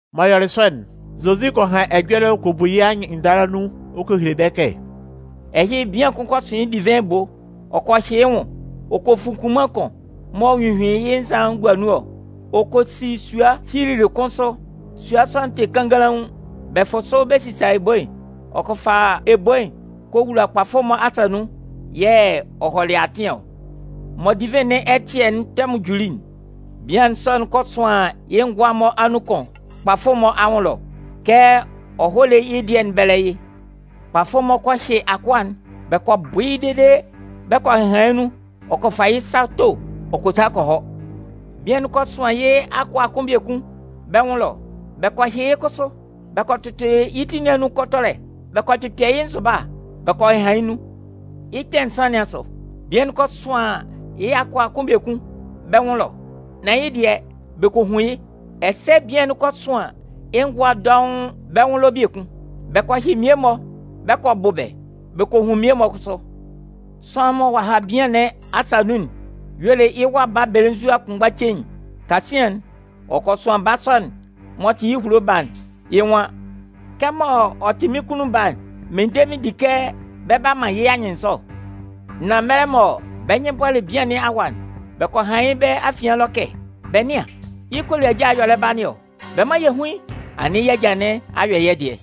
M'ɔ yɔlɩ sɔ'n, Zozi kɔ han ɛjɔlɛ ɔ kɔ bu yɩ́ anyɩnndala nun ɔ kɔ hele bɛ́ kɛ: “Ɛhɩ bian kʋn kɔ sʋn yɩ́ divɩn ebo. Ɔ kɔ hyɩ yɩ́ nwʋn. Ɔ kɔ fun kunman kʋn m'ɔ hyuhyuin yɩ́ nzan'n gua nun ɔ. Ɔ kɔ si sua hyilili kʋn sʋ. Sua sɔ'n tɩ kannganlaun. Bɛ fʋ sʋ bɛ sisa ebo'n. ɔ kɔ fa ebo'n kɔ wula kpafʋ-mɔ asa nun. Yɛ̂ ɔ hɔlɩ yɩ́ atɩn ɔ. Mɔ divɩn nɩn ɛtɩɛ'n tɛmʋn juli'n, bian'n sɔ'n kɔ sʋan yɩ́ ngʋa'n-mɔ anun kʋn kpafʋ'n-mɔ anwʋn ɛlɔ kɛ ɔ hɔ́ lé yɩ́ dɩɛ'n bɛ́lɛ yɩ́. Kpafʋ'n-mɔ kɔ hyɩ akʋa'n bɛ kɔ bʋ yɩ́ dede bɛ kɔ hɩhan yɩ́ nun ɔ kɔ fa yɩ́ sa to ɔ kɔ sa kɔ hɔ. Bian'n kɔ sʋan yɩ́ akʋa'n kʋn biekun bɛ́ nwʋn ɛlɔ. Bɛ kɔ hyɩ yɩ́ kʋsʋ bɛ kɔ tʋtʋ yɩ́ ti nɩn anun kɔtɔlɛ. Bɛ kɔ kpɩkpɛ yɩ́ nzʋba, bɛ kɔ hɩhan yɩ́ nun. Yɩ́ kpɛ̂ nsan nɩn asʋ, bian'n kɔ sʋan yɩ́ akʋa'n kʋn biekun bɛ́ nwʋn ɛlɔ. Nan yɩ́ dɩɛ, bɛ kɔ hun yɩ́. Ɛsɛ bian'n kɔ sʋan yɩ́ ngʋa'n-mɔ dɔʋn bɛ́ nwʋn ɛlɔ biekun. Bɛ kɔ hyɩ mmie-mɔ bɛ kɔ bʋ bɛ́, bɛ kɔ hun mmie-mɔ kʋsʋ. “Sʋanlan mɔ ɔ'a ha bian nɩn asa nun'n y'ɔ le yɩ́ wa baa belenzua kʋnmgba cein'n. Kasian'n, ɔ kɔ sʋan baa sɔ'n m'ɔ tɩ yɩ́ ehulo baa'n. Yɩ́ nwan: ‘Kɛmɔ ɔ tɩ mɩ́n kunnun baa'n, mɩn de mɩn di kɛ bɛ 'ba man yɩ́ anyɩnnzɔ.’ “Nan mɛlɛ mɔ bɛ́ nyɩn bɔlɩ bian nɩn awa'n, bɛ kɔ han yɩ́ bɛ́ afian ɛlɔ kɛ: ‘Bɛ nɩ́an, yɩ́ koliaja'n yɛ̂ ɔ lɛ ba nɩn ɔ. Bɛ mán yɛ hún yɩ́, anɩn yɩ́ ajâ nɩn a yɔ yɛ́ dɩɛ.’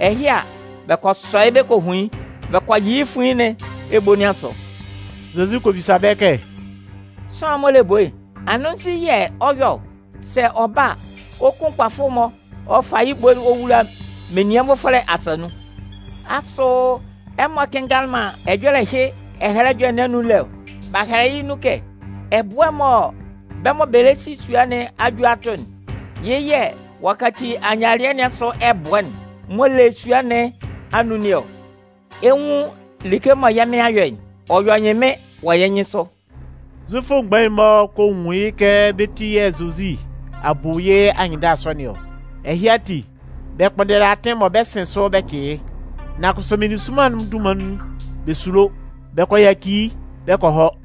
“Ɛhɩ a, bɛ kɔ sɔ yɩ́ bɛ kɔ hun yɩ́. Bɛ kɔ yɩ yɩ́ fuin nɩn ebo nɩn asʋ.” Zozi kɔ bisa bɛ́ kɛ: “Sʋanlan'n m'ɔ le ebo'n, anɩn nzu yɛ̂ ɔ 'yɔ ɔ? Sɛ ɔ ba a, ɔ 'kun kpafʋ'n-mɔ ɔ fa yɩ́ ebo'n ɔ wula menian nvʋfɔlɛ asa nun. Asʋ ɛmɔ kɩnngalɩ man ɛjɔlɛ ɛhɩ Ɛhɛlɛ Ɛjɔlɛ nɩn anun lé ɔ? B'a hɛlɛ yɩ́ nun kɛ: Ɛbʋɛ'n mɔ bɛ́ mɔ bɛ lɛ si sua nɩn a ju a tʋ'n, yɩ́ yɛ̂ ɔ'a kaci ayialɩɛ nɩn asʋ ɛbʋɛ'n m'ɔ le sua nɩn anun nɩn ɔ. Ɛ 'nwun like mɔ yɛ́ Mɩn a yɔ'n, ɔ yɔ ɛnyɩnmɩn wɔ yɛ́ nyɩnsʋ.” Zufʋ mgbain'n-mɔ kɔ nwun yɩ́ kɛ bɛ́ ti yɛ̂ Zozi a bu yɩ́ anyɩnndala sɔ nɩn ɔ. Ɛhɩ ati, bɛ kpʋnndɛlɩ atɩn mɔ bɛ 'sɩn sʋ bɛ cɩ yɩ́. Nan kʋsʋ meninsʋnman'n dunman nun, bɛ sulo. Bɛ kɔ yaci yɩ́ bɛ kɔ hɔ.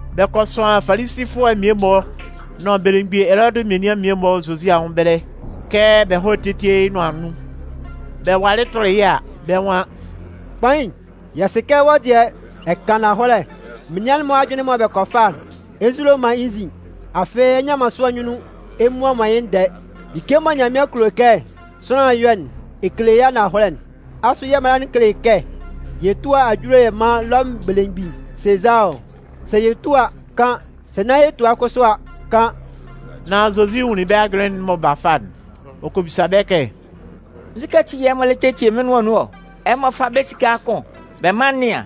Bɛ kɔ sʋan Falisifʋɛ'n mmie-mɔ nʋn belemgbin Elɔdɩ menian'n mmie-mɔ Zozi anwʋn ɛbɛlɛ kɛ bɛ hɔ́ tétie yɩ́ nʋan nun. Bɛ walɩ tʋlɩ yɩ́ a, bɛ́ nwan: “Kpain, yɛ sɩ kɛ wɔ́ dɩɛ, ɛ kan ananhɔlɛ. Menian'n-mɔ ajʋnlɩn mɔ bɛ kɔ fa'n, ɛ nzulo man yɩ́ nzin. Afɩ ɛ nnɩan man sʋanlan nyunnun ɛ mmua man yɩ́ ndɛɛ. Like mɔ Nyanmɩan kulo kɛ sʋanlan yɔ́'n, ɛ kele yɩ́ ananhɔlɛ. Asʋ yɛ́ mala'n kele kɛ yɛ túa ajule yɛ mán Lɔmʋn belemgbin Sezaa ɔ? Sɛ yɛ túa a, kan. Sɛ nán yɛ tua kʋsʋ a, kan.” Nan Zozi nwunlin bɛ́ ajʋnlɩn'n mɔ b'a fa'n, ɔ kɔ bisa bɛ́ kɛ: “Nzukɛ ati yɛ̂ ɛmɔ lɛ tetie mɩ́n nʋan nun ɔ? Ɛmɔ fá bɛ́ esika'n kʋn bɛ mán n nɩ́an.”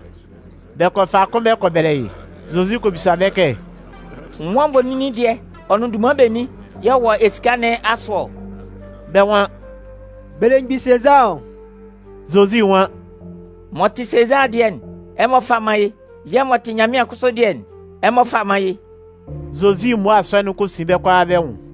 Bɛ kɔ fa kʋn bɛ kɔ bɛlɛ yɩ́. Zozi kɔ bisa bɛ́ kɛ: “Nwan nvoninnin dɩɛ ɔ nʋn dunman benin yɛ̂ ɔ wɔ esika nɩn asʋ ɔ?” Bɛ́ nwan: “Belemgbin Sezaa ɔ.” Zozi nwan: “M'ɔ tɩ Sezaa dɩɛ'n, ɛmɔ fá man yɩ́, yɛ̂ m'ɔ tɩ Nyanmɩan kʋsʋ dɩɛ'n, ɛmɔ fá man yɩ́.” Zozi mmua sɔ'n kɔ sin bɛ́ kʋalaa bɛ́ nwʋn.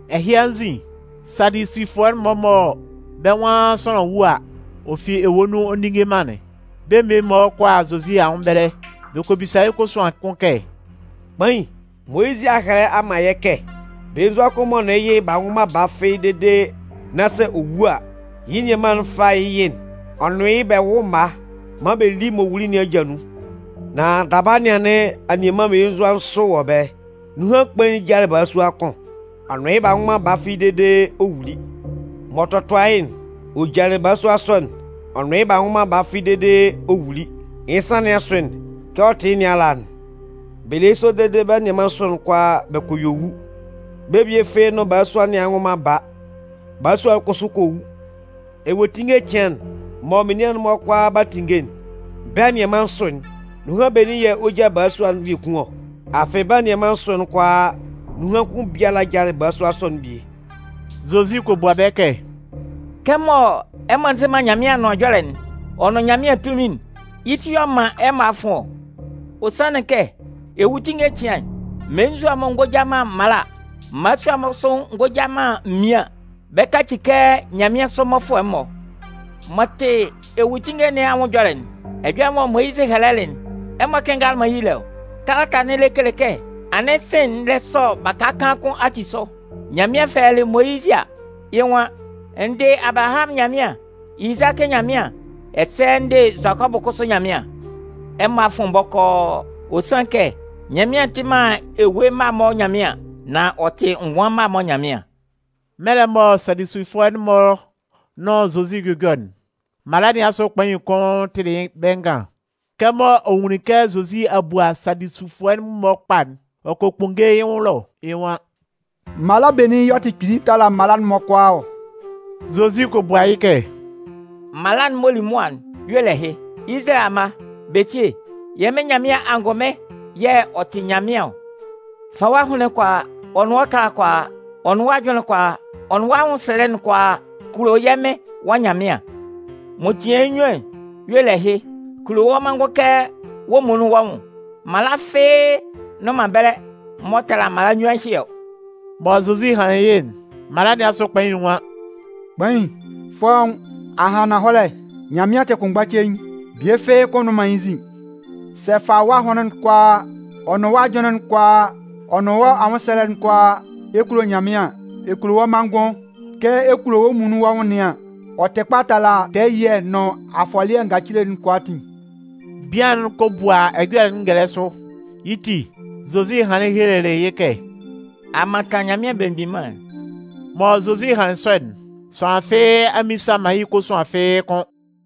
Ɛhɩ anzin, Sadusifʋɛ'n-mɔ mɔ bɛ́ nwan sʋanlan wu a, ɔ fi ewue nun ɔ ndinnge man'n, bɛ́ mmie-mɔ kɔ a Zozi anwʋn ɛbɛlɛ. Bɛ kɔ bisa yɩ́ kosuan kʋn kɛ: “Kpain, Moyizɩ a hɛlɛ a man yɛ́ kɛ: Belenzua kʋn m'ɔ nʋn yɩ́ yɩ b'a nwʋ man baa fɩ́ɩ́ dede nán sɛ ɔ wu a, yɩ́ nianman'n fá yɩ́ yɩ'n. Ɔ nʋn yɩ́ bɛ wʋ́ mma maan bɛ lí m'ɔ wuli nɩn aja nun. Nan daba anɩn anianman mmelenzua nsʋ wɔ ɛbɛlɛ. Nunhan kpain'n jalɩ balasua kʋn. Ɔ nʋn yɩ́ b'a nwʋ man baa fɩ́ɩ́ dede ɔ wuli. M'ɔ tɔtʋa yɩ́'n, ɔ jalɩ balasua sɔ'n, ɔ nʋn yɩ́ b'a nwʋ man baa fɩ́ɩ́ dede ɔ wuli. Yɩ́ nsan nɩn asʋ'n, kɛ ɔ tɩ yɩ́ nɩn ala'n. Bɛ le yɩ́ sɔ dede bɛ́ anianman nsʋ'n kʋalaa bɛ kɔ yue wu. Bɛ́ bie fɩ́ɩ́ nʋn balasua nɩn a nwʋ man baa. Balasua'n kʋsʋ kɔ wu. Ewuetinnge cɩan'n, mɔ menian'n-mɔ kʋalaa 'ba tinnge'n, bɛ́ anianman nsʋ'n, nunhan benin yɛ̂ ɔ 'ja balasua'n biekun ɔ? Afɩ bɛ́ anianman nsʋ'n kʋalaa nunhan kʋn biala jalɩ balasua sɔ'n bie.” Zozi kɔ bua bɛ́ kɛ: “Kɛmɔ ɛmɔ nzɩ man Nyanmɩan Anʋan Ɛjɔlɛ'n, ɔ nʋn Nyanmɩan tunmin'n, yɩ́ ti yɛ̂ ɔ man ɛmɔ a fʋn ɔ. Ɔ sanlɩn kɛ ewuetinnge cɩan'n, mmelenzua'n-mɔ ngɔ ja man mmala. Mmala'n-mɔ kʋsʋ ngɔ ja man mmian. Bɛ 'ba kaci kɛ nyanmɩansʋ mmɔfʋɛ'n-mɔ. M'ɔ tɩ ewuetinnge nɩn anwʋn ɛjɔlɛ'n, ɛjɔlɛ mɔ Moyizɩ hɛlɛlɩ'n, ɛmɔ kɩnngalɩ man yɩ́ lé ɔ? Kalata'n lɛ kele kɛ anɩn sɩ̂n'n lɛ sɔ baka kaan kʋn ati sʋ. Nyanmɩan fɛlɛlɩ Moyizɩ a, yɩ́ nwan: N dɩ Abalahamʋn Nyanmɩan, Izakɩ Nyanmɩan, ɛsɛ n dɩ Zʋakɔbʋ kʋsʋ Nyanmɩan? Ɛmɔ a fʋn bɔkɔɔ. Ɔ sanlɩn kɛ, Nyanmɩan tɩ man ewue mma'n-mɔ Nyanmɩan. Nan ɔ tɩ ngʋan mma'n-mɔ Nyanmɩan.” Mɛlɛ mɔ Sadusifʋɛ'n-mɔ nʋn Zozi 'jʋjɔ'n, mala nɩn asʋ kpain'n kʋn tɩlɩ bɛ́ ngan. Kɛmɔ ɔ nwunlin kɛ Zozi a bua Sadusifʋɛ'n-mɔ kpa'n, ɔ kɔ kpʋnnge yɩ́ nwʋn ɛlɔ, yɩ́ nwan: “Mala benin yɛ̂ ɔ tɩ kpili tala mala'n-mɔ kʋalaa ɔ?” Zozi kɔ bua yɩ́ kɛ: “Mala'n m'ɔ li mʋa'n y'ɔ le ɛhɩ: Izalayɛ amma, bɛ tíe, yɛ́ Mɩn Nyanmɩan angʋnmɩn yɛ̂ ɔ tɩ Nyanmɩan ɔ. Fa wɔ́ ahʋnlɩn'n kʋalaa, ɔ nʋn wɔ́ ɛkala'n kʋalaa, ɔ nʋn wɔ́ ajʋnlɩn'n kʋalaa, ɔ nʋn wɔ́ anwʋnsɛlɛ'n kʋalaa kulo yɛ́ Mɩn Nyanmɩan. M'ɔ tian yɩ́ nnyuan'n, y'ɔ le ɛhɩ: Kulo wɔ́ manngʋn kɛ wɔ́ muonun wɔ́ nwʋn. Mala fɩ́ɩ́ nnʋn man ɛbɛlɛ m'ɔ tala mala nnyuan ɛhɩ ɔ.” Mɔ Zozi hanlɩn ɛhɩ'n, mala nɩn asʋ kpain'n nwan: “Kpain, fɔ́ʋ́n, a han ananhɔlɛ! Nyanmɩan tɩ kʋnmgba cein, bie fɩ́ɩ́ kʋ́n nnʋn man yɩ́ nzin. Sɛ ɛ fa wɔ́ ahʋnlɩn'n kʋalaa, ɔ nʋn wɔ́ ajʋnlɩn'n kʋalaa, ɔ nʋn wɔ́ anwʋnsɛlɛ'n kʋalaa, ɛ kulo Nyanmɩan, ɛ kulo wɔ́ manngʋn kɛ ɛ kulo wɔ́ muonun wɔ́ nwʋn nɩn an, ɔ tɩ kpa tala tɛɛ ɛyɩɛ nʋn afɔlɩɛ ngacile'n kʋalaatin.” Bian'n kɔ bua ɛjɔlɛ'n ngɛlɛ sʋ. Yɩ́ ti, Zozi hanlɩn helelɩ yɩ́ kɛ: “A mantan Nyanmɩan Belemgbin Mân'n.” Mɔ Zozi hanlɩn sɔ'n, sʋanlan fɩ́ɩ́ a mmisa man yɩ́ kosuan fɩ́ɩ́ kʋ́n.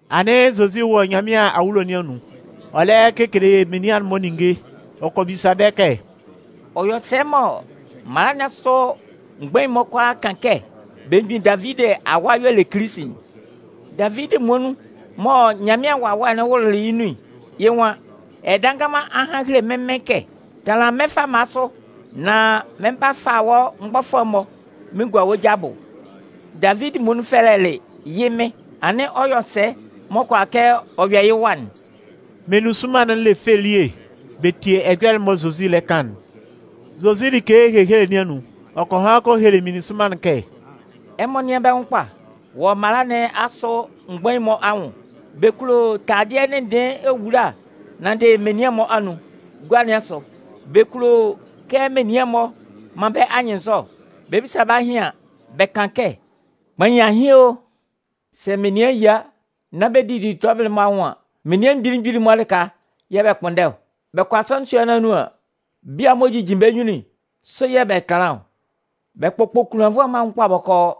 Anɩn Zozi wɔ Nyanmɩan awulo nɩn anun, ɔ lɛ kekele menian'n-mɔ ninnge. Ɔ kɔ bisa bɛ́ kɛ: “Ɔ yɔ sɛ mɔ mala nɩn asʋ mgbain'n-mɔ kʋalaa kan kɛ belemgbin Davidi awa y'ɔ le Kilisi'n? Davidi muonun, mɔ Nyanmɩan Wawɛ'n wʋlʋlɩ yɩ́ nun'n, yɩ́ nwan: Ɛdannganman a han a hele mɩ́n Mɩn kɛ: Tanlan mɩ́n fama sʋ, nán mɩn 'ba fa wɔ́ mgbɔfʋɛ'n-mɔ mɩn gua wɔ́ ja abʋ. Davidi muonun fɛlɛlɩ yɩ́ Mɩn. Anɩn ɔ yɔ sɛ m'ɔ kʋala kɛ ɔ yɔ yɩ́ wa'n?” Meninsʋnman'n le fɛ elie bɛ tie ɛjɔlɛ'n mɔ Zozi lɛ kan'n. Zozi like ehehele nɩn anun, ɔ kɔ han kɔ hele meninsʋnman'n kɛ: “Ɛmɔ nɩ́an bɛ́ nwʋn kpa wɔ mala nɩn asʋ mgbain'n-mɔ anwʋn. Bɛ kulo taladɩɛ ndɩnndɩɩn ewula nanndɩ menian'n-mɔ anun. Gua nɩn asʋ, bɛ kulo kɛ menian'n-mɔ man bɛ́ anyɩnnzɔ. Bɛ 'bisa bɛ́ ahɩn an, bɛ kan kɛ: ‘Kpain, ahɩn o!’ Sɛ menian yia nán bɛ 'didi tɔbɩlɩ'n-mɔ anwʋn an, menian mgbili mgbili lɩka yɛ̂ bɛ kpʋnndɛ ɔ. Bɛ kɔ asɔnɩn sua'n-mɔ anun an, bia'n-mɔ m'ɔ jijin bɛ́ nyunnun'n, sʋ yɛ̂ bɛ tanlan ɔ. Bɛ kpʋkpʋ kunlannvʋɛ'n-mɔ anwʋn kpa bɔkɔɔ.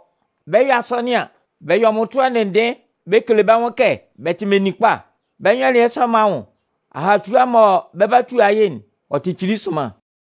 Bɛ 'yɔ asɔnɩn an, bɛ yɔ mmʋtʋɛ ndɩnndɩɩn bɛ kele bɛ́ nwʋn kɛ bɛ tɩ meninkpa. Bɛ́ nyɔlɩɛ sɔ'n-mɔ anwʋn, ahatua mɔ bɛ 'ba nyan yɩ́'n, ɔ tɩ kpili sʋnman.”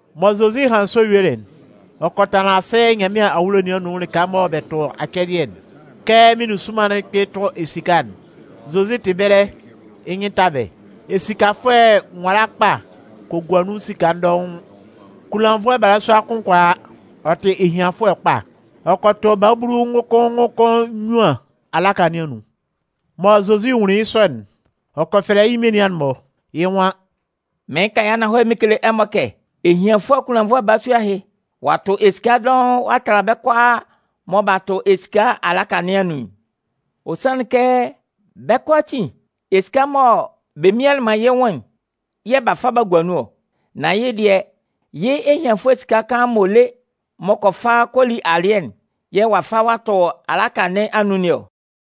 Mɔ Zozi hanlɩn sɔ yuelɩ'n, ɔ kɔ tanlan asɩ Nyanmɩan awulo nɩn anun lɩka mɔ bɛ tʋ acɛdɩɛ'n. Kɛ meninsʋnman'n kpɩn tʋ esika'n, Zozi tɩ ɛbɛlɛ yɩ́ nyɩn ta bɛ́. Esikafʋɛ nwala kpa kɔ gua nun esika dɔʋn. Kunlannvʋɛ balasua kʋn kɔ a, ɔ tɩ ehianfʋɛ kpa. Ɔ kɔ tʋ babulu ngʋkʋn ngʋkʋn nnyuan alaka nɩn anun. Mɔ Zozi nwunlin yɩ́ sɔ'n, ɔ kɔ fɛlɛ yɩ́ menian'n-mɔ. Yɩ́ nwan: “Mɩɩn kan yɩ́ ananhɔlɛ mɩn kele ɛmɔ kɛ, ehianfʋɛ kunlannvʋɛ balasua ɛhɩ, ɔ'a tʋ esika dɔʋn ɔ'a tala bɛ́ kʋalaa mɔ b'a tʋ esika alaka nɩn anun'n. Ɔ sanlɩn kɛ, bɛ́ kʋalaatin, esika mɔ bɛ mianlɩn man yɩ́ nwʋn'n yɛ̂ b'a fa b'a gua nun ɔ. Nan yɩ́ dɩɛ, yɩ́ ehianfʋɛ esika kaan m'ɔ le m'ɔ kɔ fa kɔ li alɩɛ'n yɛ̂ ɔ'a fa ɔ'a tʋ alaka nɩn anun nɩn ɔ.”